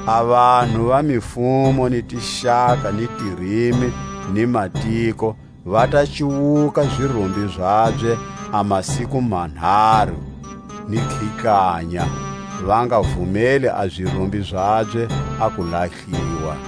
A vanhu va mifumo ni tixaka ni tirimi ni matiko va ta cuwuka zirumbi zabye a masiku manharu ni khihlanya, va nga vumeli a zirumbi zabye a ku lahliwa.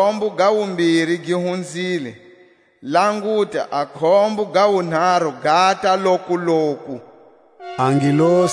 A khombo ga wumbiri gi hunzile, languta, a khombo ga wunharu gata lokuloku. A mpunzu wo gumesa.